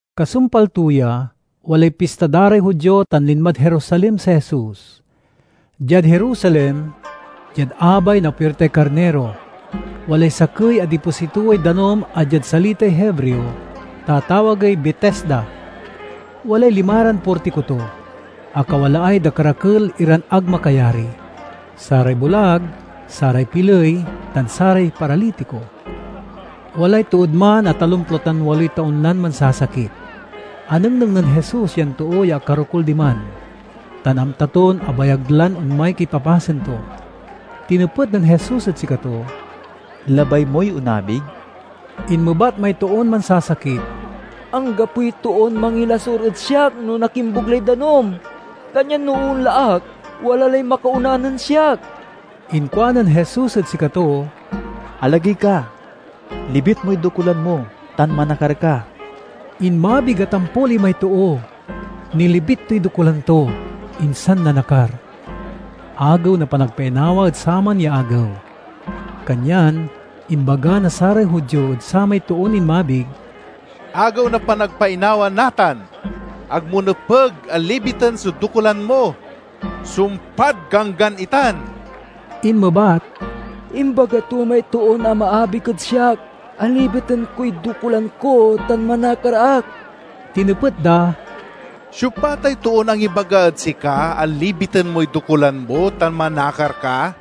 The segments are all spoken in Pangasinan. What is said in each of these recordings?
Kasumpal to ya, walay pista da ray Judio tan linmad Jerusalem si Jesus. Diad Jerusalem, diad abay na Puirtay Karniro, walay sakey a dipositoway danum a diad salitay Hebreo, tatawagey Betesda. Walay limaran portiko to, a kawalaay dakerakel iran ag makayari: saray bulag, saray piley, tan saray paralitiko. Walay tood man a talomplo tan waloy taon lan mansasakit. Anengneng nen Jesus yan too ya akarokul diman, tan amta ton abayag lan onmay kipapasen to. Tinepet nen Jesus ed sikato, "Labay moy onabig?" Inmebat may toon mansasakit, "Anggapoy toon mangilasur ed siak no nakimbug lay danum, kanyan no oonla ak, wala lay makaona nen siak." Inkuanen Jesus ed sikato, "Alagey ka, libit moy dokulan mo, tan manakar ka." Inmabig a tampol imay too, nilibit toy dokulan to, insan nanakar. Agew na Panagpainawa ed saman ya agew, kanyan imbaga na saray Judio ed samay toon inmabig, "Agew na Panagpainawa natan! Ag mo nepeg a libiten so dokulan mo. Sumpad Ganggan itan." Inmebat, "Imbaga to may toon amaabig ed siak a libiten koy dokulan ko tan manakar ak." Tinepet da, "Siopa tay toon angibaga ed sika a libiten moy dokulan mo tan manakar ka?"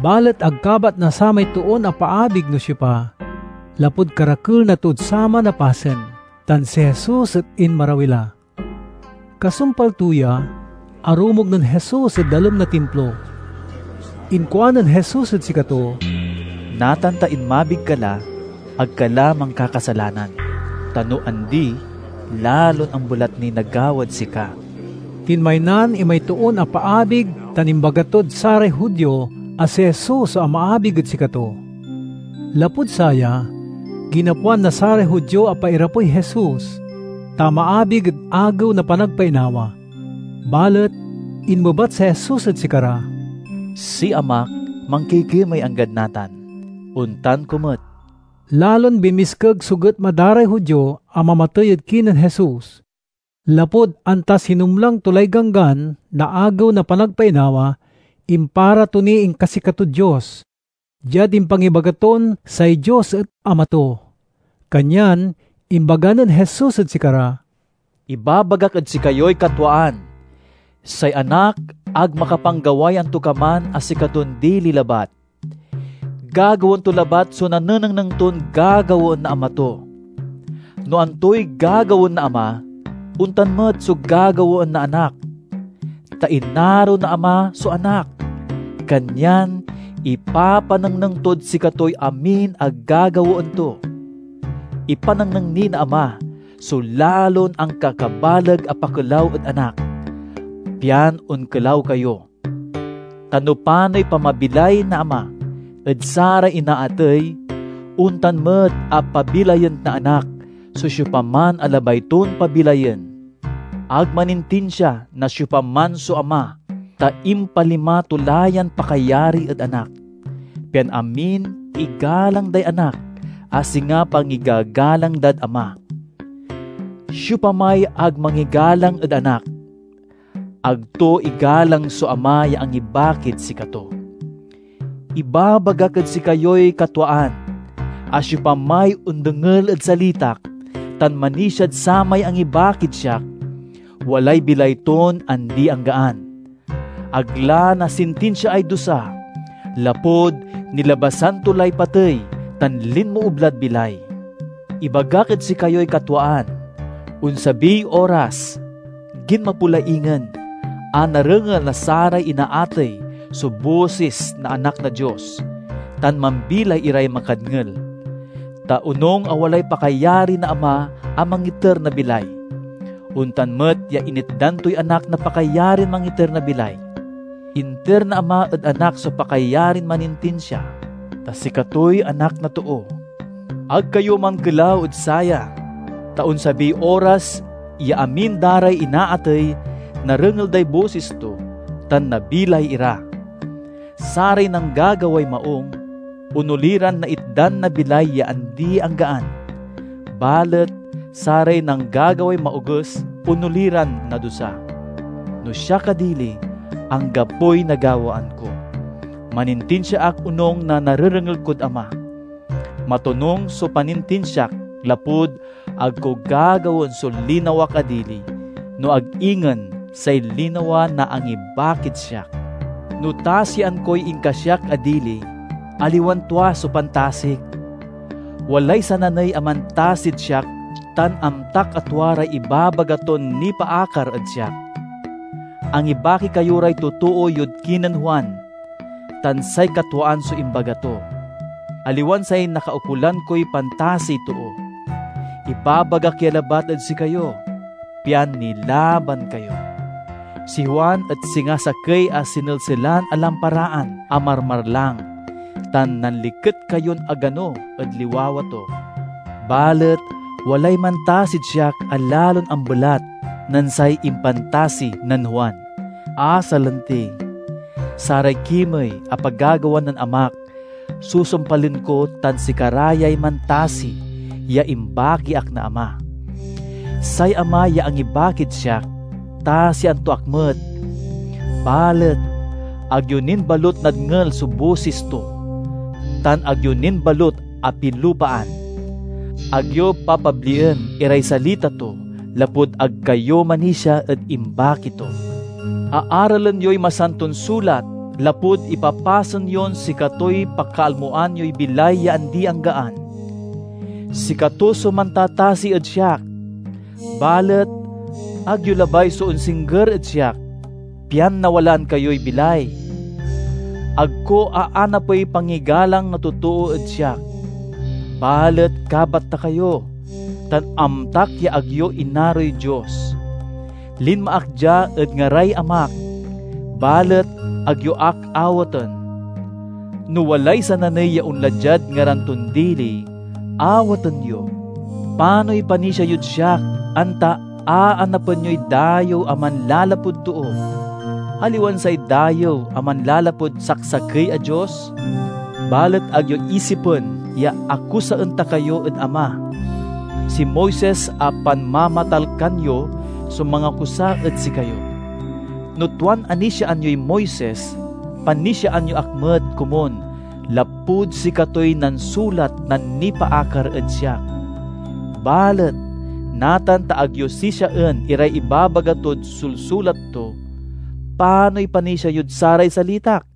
Balet ag kabat na samay toon apaabig no siopa, lapud karakel na tood saman a pasen, tan si Jesus et inmarawi la. Kasumpal to ya, arumog nen Jesus ed dalem na Timplo. Inkuanen Jesus ed sikato, "Natan ta inmabig ka la, ag ka la mankakasalanan, ta no andi lalon ambelat niy nagawad sika." Tinmaynan imay toon apaabig tan imbaga tod saray Judio a si Jesus so amaabig ed sikato. Lapud saya, ginapoan na saray Judio a pairapey Jesus, ta amaabig ed Agew na Panagpainawa. Balet inmebat si Jesus ed sikara, "Si Amak mankikimey anggad natan; ontan ko met." Lalon binmiskeg so getma da ray Judio a mamatey ed kinen Jesus, lapud anta sinumlang to lay Ganggan na Agew na Panagpainawa, impara to niy inkasikatod Dios diad impangibaga ton say Dios et Ama to. Kanyan imbaga nen Jesus ed sikara, "Ibabagak ed sikayoy katwaan: say Anak ag makapanggaway antokaman a sikaton dili labat. Gagawaen to labat so nanenengneng ton gagawaen na Ama to. No antoy gagawaen na Ama, ontan met so gagawaen na Anak. Ta inaro na Ama so Anak, kanyan ipapanengneng tod sikatoy amin a gagawaen to. Ipanengneng ni na Ama so lalon ankakabaleg a pakelaw ed Anak, pian onkelaw kayo. Ta no panoy pamabilay na Ama ed saray inaatey, ontan met a pabilayen na Anak so siopaman a labay ton pabilayen. Ag manintinsia na siopaman so Ama, ta impalima to la yan pakayari ed Anak, pian amin igalang day Anak a singa pangigagalang dad Ama. Siopamay ag mangigalang ed Anak, ag to igalang so Ama ya angibakid sikato. "Ibabagak ed sikayoy katwaan a siopamay ondengel ed salitak tan manisiad samay angibakid siak, walay bilay ton andi-anggaan; ag la nasintinsiaay dusa, lapud nilabasan to lay patey tan linmoob lad bilay. Ibagak ed sikayoy katwaan: onsabiy oras, ginmapo la ingen, a narengel na saray inaatey so bosis na Anak na Dios, tan mambilay iray makadngel. Ta onung a walay pakayari na Ama a mangiter na bilay, ontan met ya initdan toy Anak na pakayarin mangiter na bilay. Inter na Ama ed Anak so pakayarin manintinsia, ta sikatoy Anak na Too. Ag kayo mankelaw ed saya, ta onsabiy oras ya amin da ray inaatey narengel day bosis to, tan nabilay ira. Saray nanggagaway maung, onoli ran naitdan na bilay ya andi-anggaan; balet saray nanggagaway maoges, onoli ran nadusa." "No siak a dili, anggapoy nagawaan ko. Manintinsia ak onung na narerengel kod Ama. Matonung so panintinsiak lapud ag ko gagawaen so linawak a dili, no ag ingen say linawa na angibakid siak. "No tasian koy inkasiak a dili, aliwan tua so pantasik. Walay sananey a mantasid siak tan amtak a tua ray ibabaga ton nipaakar ed siak. Angibaki kayo ray totoo yod kinen Juan, tan say katwaan so imbaga to. Aliwan say nakaukolan koy pantasiy too. Ibabagak ya labat ed sikayo, pian nilaban kayo. Si Juan et singa sakey a sinelselan a lamparaan a marmarlang, tan nanliket kayon agano ed liwawa to. Balet walay mantasid siak a lalon ambelat nen say impantasi nen Juan, a salanti: saray kimey a pagagawa nen Amak susumpalen ko tan sikara yay mantasi ya imbaki ak na Ama. Say Ama ya angibakid siak, tasian to ak met. Balet, ag yo nin balut nadngel so bosis to tan ag yo nin balut apilupaan. Ag yo papablien iray salita to lapud ag kayo manisia ed imbaki to. Aaralen yoy Masanton Sulat lapud ipapasen yon sikatoy pakalmoan yoy bilay ya andi-anggaan. Sikato so mantatasi ed siak. Balet, ag yo labay so onsingger ed siak pian nawalaan kayoy bilay. "Ag ko aanapey pangigalang na totoo ed siak. Balet kabat ta kayo, tan amtak ya ag yo inaroy Dios. Linma ak dia ed ngaray Amak, balet ag yo ak awaten. No walay sananey ya onla diad ngaran ton dili, awaten yo. Panoy panisia yod siak anta aanapen yoy dayew a manlalapud too, aliwan say dayew a manlalapud saksakey a Dios? Balet ag yo isipen ya akusaen ta kayo ed Ama. Si Moises a panmamatalkan yo so mangakusa ed sikayo. No tuan anisiaan yoy Moises, panisiaan yo ak met komun lapud sikatoy nansulat na nipaakar ed siak. Balet, natan ta ag yo sisiaen iray ibabaga tod sulsulat to, panoy panisia yod saray salitak?"